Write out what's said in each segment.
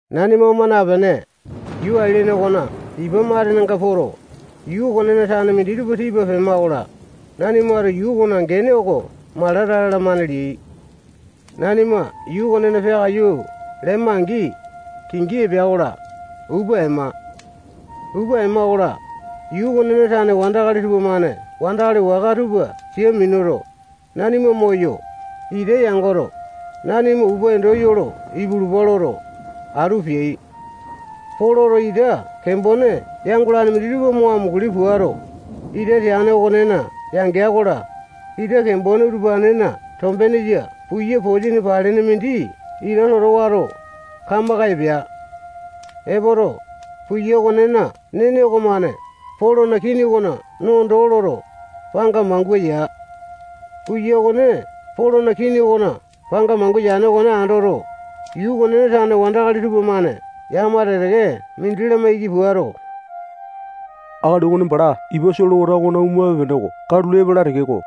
Nanima oma napene, yuu ailene okona ipa matenenga poto, yuu okonena tane minditupa tipa pema-kola, nanimato yuu okona gene oko Malata lalamane leai. Nanima yuu okonena peakaiyu lema-angi, kingi epea-kola, upa ema. Upa ema-kola, yuu okonena tane wandakali tupamane wandakali waka tupa sia minuto, nanima moyo, ita yangoto, nanima upa endo yolo ipulupa loto, atu peai. Poloto ita kembone yangolane minditupa mo amunguli puato, ita teane okonena yangea-kola, ita kembone utupanena tombenenga puya posini paleane mindi ita toto wato, kamaka epea. Epoto, puya okonena nene okomane Polona kini okona no doo loto, panga mangua ya. Puya okone Polona kini okona panga mangua yane okone andoto, yuu okonena tane wandakali tupamane yakama teke-teke mindi lamaiki puato, akali okone bala ipa solewata okona omape-pene oko katulo epala tekeko,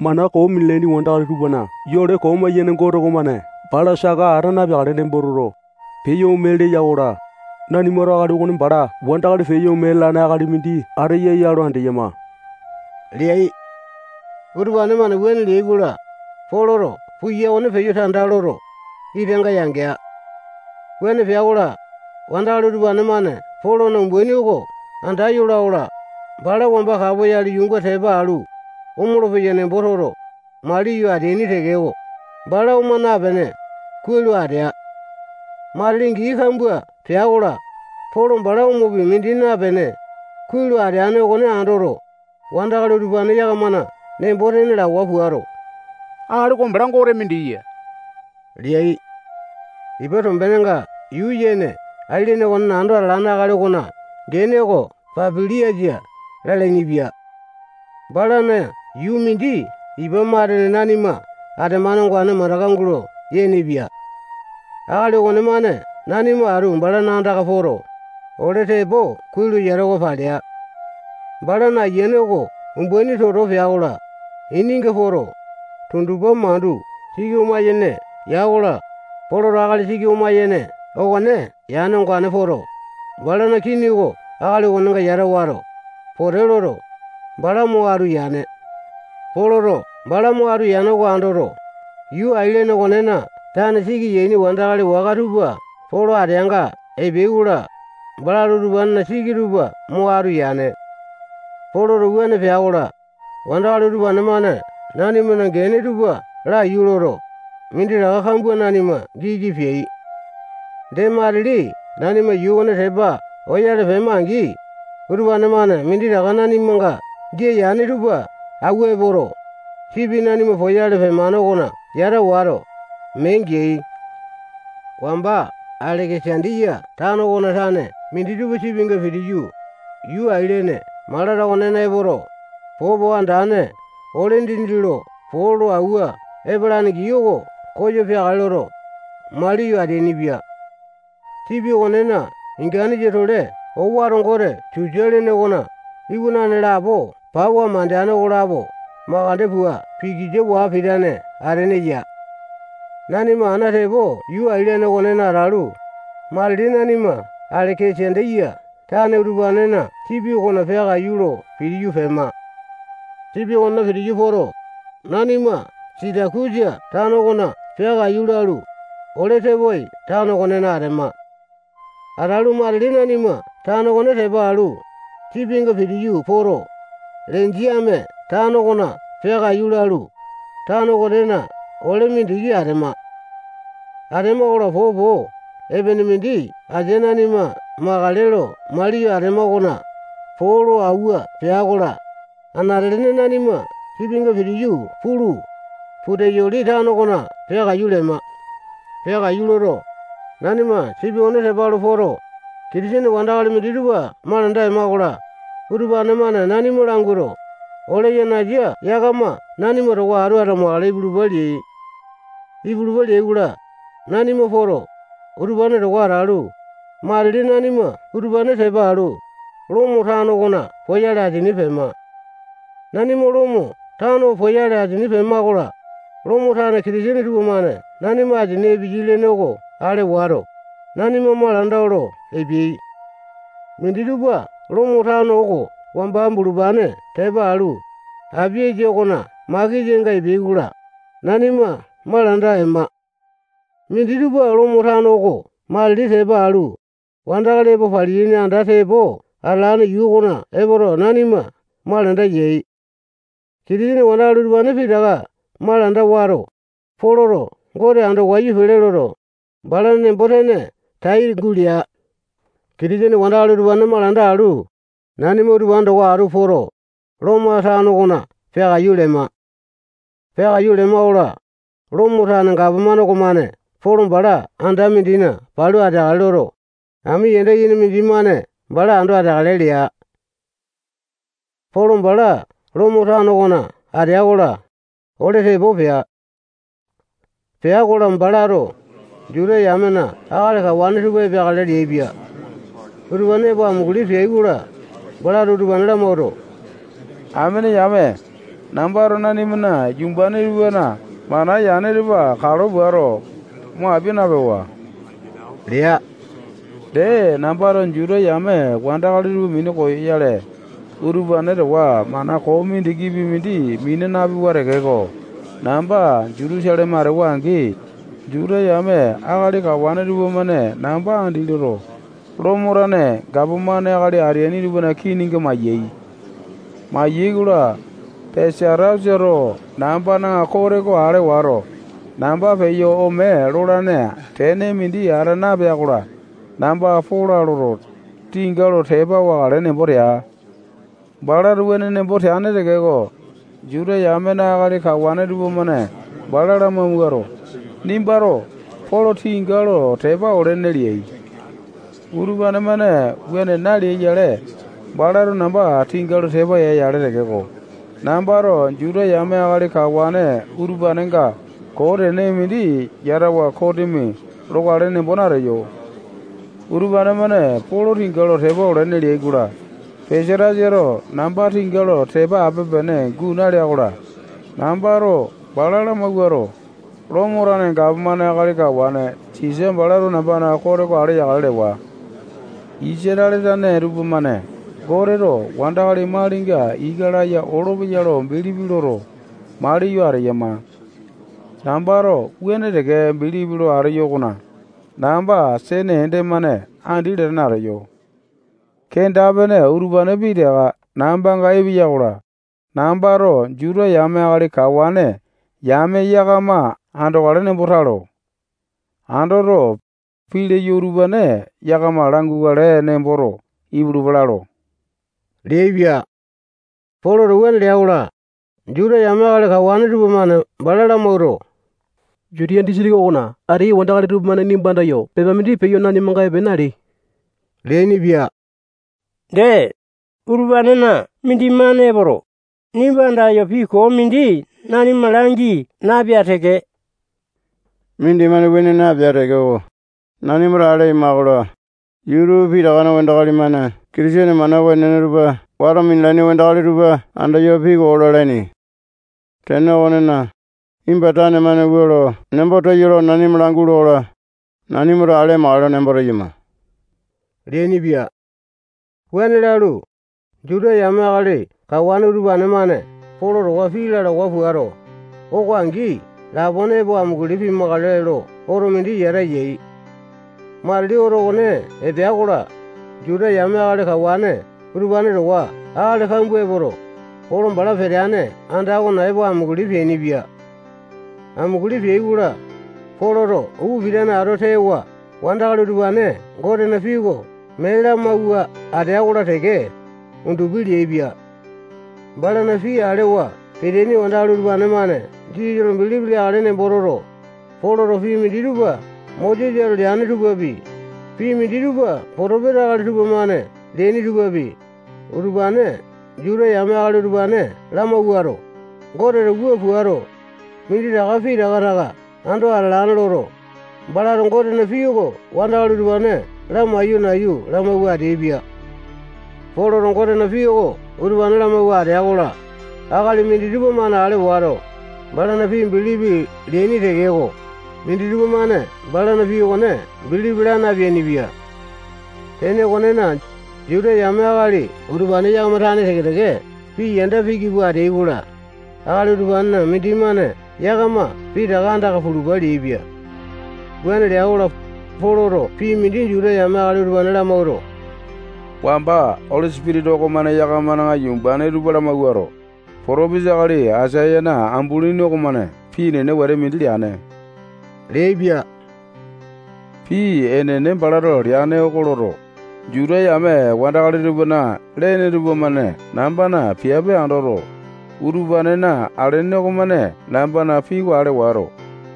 mana koo minalaini wandakali tupana yole koo maiyane Gote okomane bala saka ata napeakale nembo toto, peyo ome leya-kola, nanimato akali okone bala wandakali peyo ome lalane akali mindi ateya ya lo andeyama leai. Utupane-mane wuane leai-kola, Poloto puya okone peyo tanda loto, itanga yangea. Wuane pea-kola, wandakali utupane-mane Polona umbaini oko anda yola-kola, bala wamba kapoyale yuunga tepa alu, omolo-peya nembo toto, maliyo ateaini tekeko, bala oma napene, kuai lo atea. Matili gii kambua pea-kola, Polo bala omopi mindi napene, kuai lo ateane okone andoto, wandakali utupane yakamana nembo-tene lawa puato, akali oko bala gote mindi ya leai. Ipa tombenenga yuu yene ailene okonena ando atalane akali okona gene oko Papiliasa lalainipia. Balana yuu mindi ipa matene nanima atemane ongane mandaka gulo yenepia. Akali okonemane nanima atu balana andaka poto, ole tepo kuai lo yatawa palea. Balana Ayiane oko umbaini toto pea-kola, ininga poto, tundupa mandu siki oma-yene ya-kola, Poloto akali siki oma-yene okone yane ongane poto, balana kini oko akali okonenga yata wato, pote loto, bala mo atu yane. Poloto bala mo atu yane oko andoto, yuu ailene okonena tane siki yaini wandakali waka tupa Polo ateanga epeai-kola, balato utupanena siki tupa mo atu yane. Poloto wuane pea-kola, wandakali utupane-mane nanimana gene tupa laiyu loto, minditaka kambua nanima giki peai. Dee, matili nanima yuu okone tepa oyale pema-angi, utupane-mane minditaka nanimanga jia yane tupa awua epoto, sipi nanima poyale pemane okona yata wato, mee geai. Wamba Aleke-sandiya tano okona tane minditupa sipinga pitiyu, yuu Ailene Malata okonena epoto, popo andane ole dindi lo po lo awua epalane gii oko koyo peakale loto, maliyo ateainipia. Sipi okonena inganesa-tole owato gote Susa lene okona iwanane lapo pawa mandene okonelapo makande pua pikisa waa pitane atene ya. Nanima ana tepo yuu ailene okonena atalu, matili nanima Aleke-sandiya tane utupanena sipi okona peakaiyu lo pitiyu pema. Sipi okonena pitiyu poto, nanima Sitakusa tano okona peakaiyu lalu, ole tepoai tano okonena atema. Atalu, matili nanima tano okone tepa alu, sipinga pitiyu poto, Lenjiame tano okona peakaiyu lalu, tano okonena ole mindiki atema. Atema-kola, popo epene mindi asia nanima makale lo maliyo atema okona poo lo awua pea-kola, anate-lene nanima sipinga pitiyu pulu, Puteyoli tano okona peakaiyu lema. Peakaiyu loto, nanima sipi okone tepa alu poto, Kitisene wandakali minditupa malanda ema-kola, utupane-mane nanima languato, ole yanasa yakama nanima towa atu atamakale ipulupa leai. Ipulupa leai-kola, nanima poto, utupane towa atalu, matili nanima utupane tepa alu, Lomo tano okona poyale asini pema. Nanima Lomo tano poyale asini pema-kola, Lomo tane Kitisene tupamane nanima asini epeyai lene oko ale wato, nanima malanda olo epeai. Minditupa Lomo tano oko wamba bulupane tepa alu, Apiasa okona makesanga epeai-kola, nanima malanda ema. Minditupa Lomo tano oko matili tepa alu, wandakali epo paliyaini anda tepo atalane yuu okona epoto, nanima malanda yai. Kitisene wandakali utupane pitaka malanda wato, Poloto Gote ando wayu pele loto, balana nembo-tene tai gulea. Kitisene wandakali utupane malanda alu, nanima utupane towa atu poto, Lomo tano okona peakaiyu lema. Peakaiyu lema-kola, Lomo tane gapomane okomane Polo bala anda mindina palu ateakale loto, ami yanda yene mindimane bala ando ateakale lea. Polo bala Lomo tano okona atea-kola, ole tepo pea. Pea-kola, balato Juta yamena akali kawane tupa epeakale leaipia. Utupane epo amunguli peai-kola, balato utupane lamawuato, amene yame, nambato nanimana yumbane tupana mana yane tupa kalo puato, mo apia napewa lea. Dee, nambato Juta yame wandakali tupa minu koyoyale, utupane towa mana koo mindikipi mindi mina napewa tekeko, namba Jutusaleme atewa-angi, Juta yame akali kawane tupamane namba andi loto, Lomo tane gapomane akali ateaini tupana kininga maiyai. Mayai-kola, Pesatasato nambana kote oko ale wato, namba peyo ome lolane tene mindi ata napea-kola, namba pola loto, tinga lo tepa wakale nembo tea. Balato wuane nembo teane tekeko, Juta yamena akali kawane tupamane bala lamawuato, nimbato Polo tinga lo tepa olene leai. Utupane-mane wuane naleai-yale, balato namba tinga lo tepa ya-yale tekeko, nambato Juta yame akali kawane utupanenga koo tene mindi yatawa kosimi lokale nembo nateyo. Utupane-mane Polo tinga lo tepa olene leai-kola, Pesatasato namba tinga lo tepa ape-pene guu nalea-kola, nambato bala lamawauto, Lomo tane gapomane akali kawane Sisa balato nambana kote oko ale yakale lewa. Isatale tane tupamane Goteto wandakali malinga ika laya olopeya lo bilipi loto, maliyo ateyama. Nambato wuane teke bilipi lo ateyo okona, namba sene ende-mane andi latane ateyo. Kenda-pene utupane pitaka nambanga epea-kola, nambato Juta yame akali kawane yame yakama andokale nembo talo. Andoto, pii leyo utupane yakama langukale nemboto, ipulupa lalo leaipia. Poloto wuane lea-kola, Juta yame akali kawane tupamane bala lamawuato, Jutiya disitiki okona ateyai wandakali tupamane nimba andayo pepa mindi peyo nanimanga epe naleai leainipia. Dee, utupanena mindimane epoto, nimba andayo pii koo mindi nanima langi napea teke. Mindimane wuane napea tekeko, nanimato ale aima-kola, yuu tupa pitakana wandakali-mane Kitisene mana wenene tupa wato minalaini wandakali tupa andayo pii koo lalaini. Tene okonena, nimba tane-mane wua lo nembo teyo lo nanima langule-kola, nanimato ale amakale nembo teyama leainipia. Wuane lalu, Juta yame akali kawane utupane-mane Polo towa pii lalawa puato, oko angi lapone epo amunguli pimakale lo oto mindi yata yai. Matili oto okone epea-kola, Juta yame akali kawane utupane towa akali kambua epoto, Polo bala peteane anda okona epo amunguli peainipia. Amunguli peai-kola, Poloto upa pitane ato tewa wandakali utupane Gotena pii oko mee lamawua atea-kola teke, undupi leaipia. Balana pii alewa peteaini akali utupane-mane Jisasa lo bilipi leakale nembo toto, Poloto pii minditupa Mosesato leane tupapi, pii minditupa potopesa akali tupamane leaini tupapi, utupane Juta yame akali utupane lamawuato, Goteto wua puato, minditaka pitaka taka ando atalane loto, balato Gotena pii oko wandakali utupane lamaiyo nayu lamawua ateaipia. Poloto Gotena pii oko utupane lamawua atea-kola, akali minditupa-mane ale wato, balana pii bilipi leaini tekeko, minditupa-mane balana pii okone bilipi la napeainipia. Tene okonena, Juta yame akali utupane yakama tane teke-teke pii yanda piki pua ateai-kola, akali utupanena mindimane yakama pitaka andaka pulupa leaipia. Wuane lea-kola, Poloto pii mindi Juta yame akali utupane lamawuato, wamba Oli Sipitisa okomane yakamana yumbane tupa lamawuato, potopesa akali Aisayana ambulini okomane pii enene wete mindi leane leaipia. Pii enene balato leane oko loto, Juta yame wandakali tupana lene tupamane nambana piape andoto, utupanena alene okomane nambana pii oko ale wato,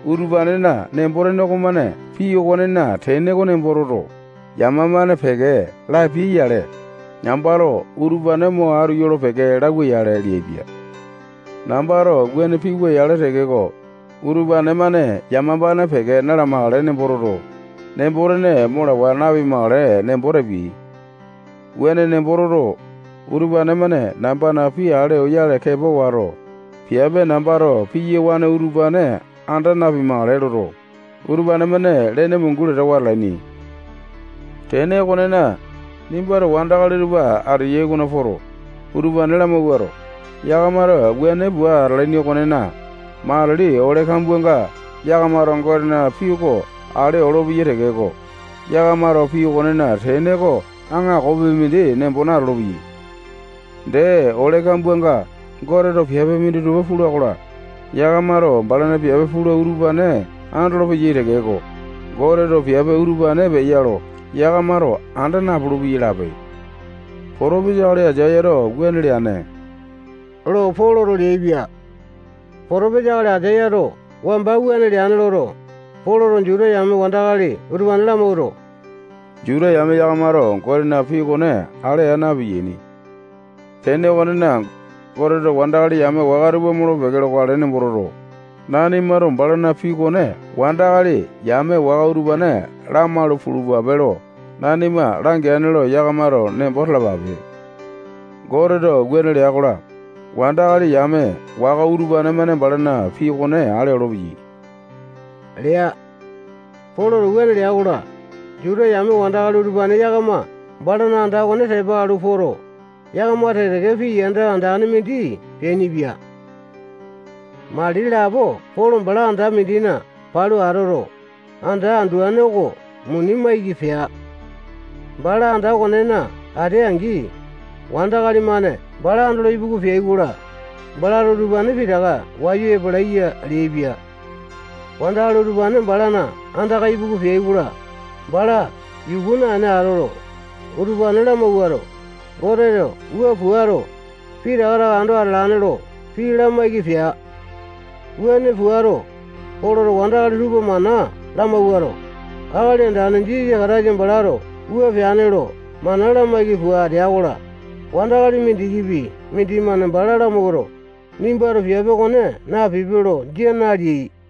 utupanena nembo-tene okomane pii okonena tene oko nembo toto, yamapane peke lapiai-yale, nambato utupane mo atu yolo-peke lauwa-yale leaipia. Nambato wuane piwa-yale tekeko, utupane-mane yamapane peke na-lamakale nembo toto, nembo-tene mo lawa napimakale nembo tapiai. Wuane nembo toto, utupane-mane nambana pii ale oyale kepa wato, piape nambato piyawane utupane anda napimakale loto, utupane-mane lene mungu latawa atalaini. Tene okonena, nimbato wandakali utupa ateyai okona poto, utupane lamawuato, yakamato wuane pua atalaini okonena, matili ole kambuanga yakamato Gotena pii oko ale olopeyai tekeko, yakamato pii okonena tene oko aŋakopi mindi nembo natolo-peyai. Dee, ole kambuanga Goteto piape minditupa pula-kola, yakamato balana piape pula utupane andolopeya tekeko, Goteto piape utupane peya lo yakamato anda napulu-peyai lape. Potopesa akali Aisayato wuane leane lo Poloto leaipia. Potopesa akali Aisayato wamba wuane leane loto, Poloto Juta yame wandakali utupane lamawuato, Juta yame yakamato Gotena pii okone ale aa na-piyaini. Tene okonena, Goteto wandakali yame waka tupa molo-peke lokale nembo toto, nanimato balana pii okone wandakali yame waka utupane lamalu pulupape lo nanima langeane lo yakamato nembo talapape. Goteto wuane lea-kola, wandakali yame waka utupane-mane balana pii okone ale olopeyai lea. [Poloto wuane lea-kola, Juta yame wandakali utupane yakama balana anda okone tepa alu poto, yakama teke-teke pii yanda andane mindi peainipia]. Mali lapo Polo bala anda mindina palu atoto, anda anduane oko muni maiki pea. Bala anda okonena atea-angi, wandakali-mane bala andolo ipuku peai-kola, balato utupane pitaka wayu epalaiya leaipia. Wandakali utupane balana andaka ipuku peai-kola, bala yuku naene atoto, utupane lamawuato, Goteto wua puato, pitaka taka ando atalane lo pii lamaiki pea. Wuane puato, Poloto wandakali tupa mana lamawuato, Akali Andane Jisasa Kataisa balato wua peane lo mana lamaiki pua atea-kola, wandakali mindikipi mindimane bala lamawuato, nimbato piape okone napipe lo, jia naleai.